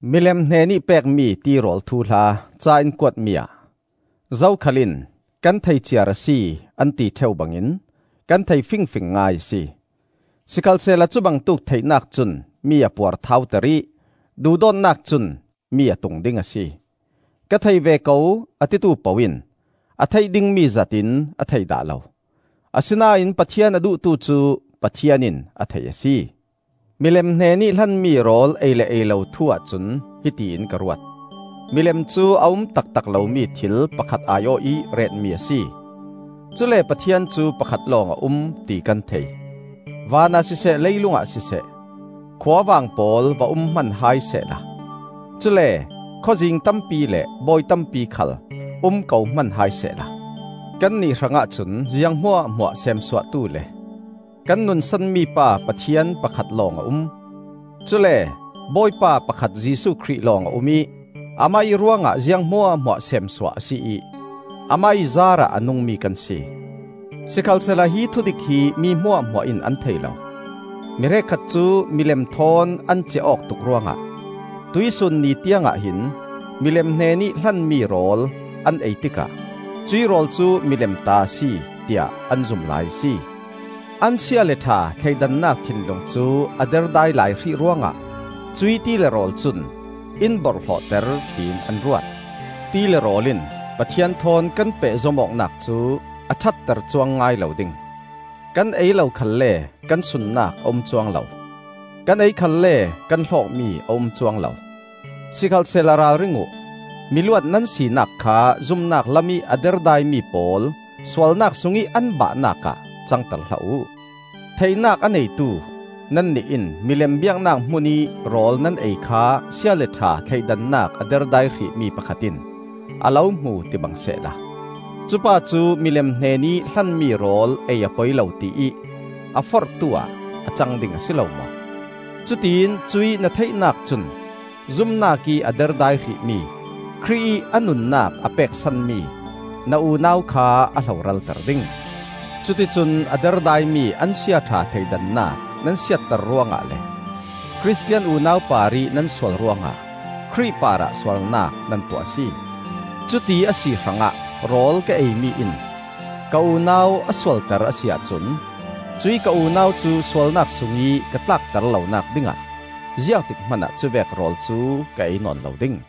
Milem hnenih pekmi tirawl thuhla ca in kuatmi ah: zokhal in, “Kan thei ciar a si,” an ti ṭheu bangin kan thei fingfing ngai a si. Sikhalsehla cubangtuk theihnak cun mi a puarthauter ih duhdawtnak cun mi a tungding a si. Ka thei ve ko, a titu poh in a theih dingmi zat in a thei dah lo. Asinain Pathian a duhtu cu Pathian in a thei a si. Milem hnenih hlanmi rawl ei le ei lo thu-ah cun hiti in ka ruat: milem cu a um taktak lomi thil pakhat ai-awh ih retmi a si; cule Pathian cu pakhat lawng a um, ti kan thei. Van ah siseh leilungah siseh, “khuavang pawl,” va um hman hai sehla, cule “khawzing,” tampi le “bawi,” tampi khal um ko hman hai sehla, kannih hrangah cun ziang hmuahhmuah semsuahtu le kan nunsanmi pa Pathian pakhat lawng a um; cule Bawipa pakhat Jesuh Khrih lawng a um ih Amah ih ruangah ziang hmuahhmuah seemsuah a si ih Amah ih zaarah a nungmi kan si. Sikhalsehla hi thudik hi mi hmuahhmuah in an thei lo. Mi hrekkhat cu milem thawn an ciah awk tuk ruangah tuihsun ni tiangah hin milem hnenih hlanmi rawl an ei tikah cuih rawl cu milem ta a si, tiah an zum lai a si. An sia le ṭha thleidannak thinlung cu a derdai lai hrih ruangah cuih ti le rawl cun in borhhlawhter tiin an ruat. Ti le rawl in Pathian thawn kan pehzom awknak cu a ṭhatter cuang ngai lo ding. Kan ei lo khalle kan sunnak a um cuang lo; kan ei khalle kan hlawkmi a um cuang lo. Sikhalsehla ralring uh: miluat nan sinak kha zumnak lamih a derdaimi pawl sualnak sungih an bahnak ah cangter hlah uh. Theihnak a neitu nannih in milem biaknak hmunih rawl nan ei kha sia le ṭha thleidannak a derdai hrihmi pakhat in a lo hmu tibang sehla, cupa cu milem hnenih hlanmi rawl ei a poi lo tiih a forhtuah a cang ding a si lo maw? Cutiin cuih na theihnak cun zumnak ih a derdai hrihmi, Khrih ih a nunnak a pek sanmi na unau kha a hloralter ding! Cuticun a derdaimi an siaṭha thleidannak nan siatter ruangah le Khristian unau parih nan sual ruangah Khrih parah sualnak nan tuah a si. Cuti a si hrangah rawl ka eimi in ka unau a sualter a si ahcun cuih ka unau cu sualnak sungih ka tlakter lonak dingah ziangtik hmanah cuvek rawl cu ka ei nawn lo ding.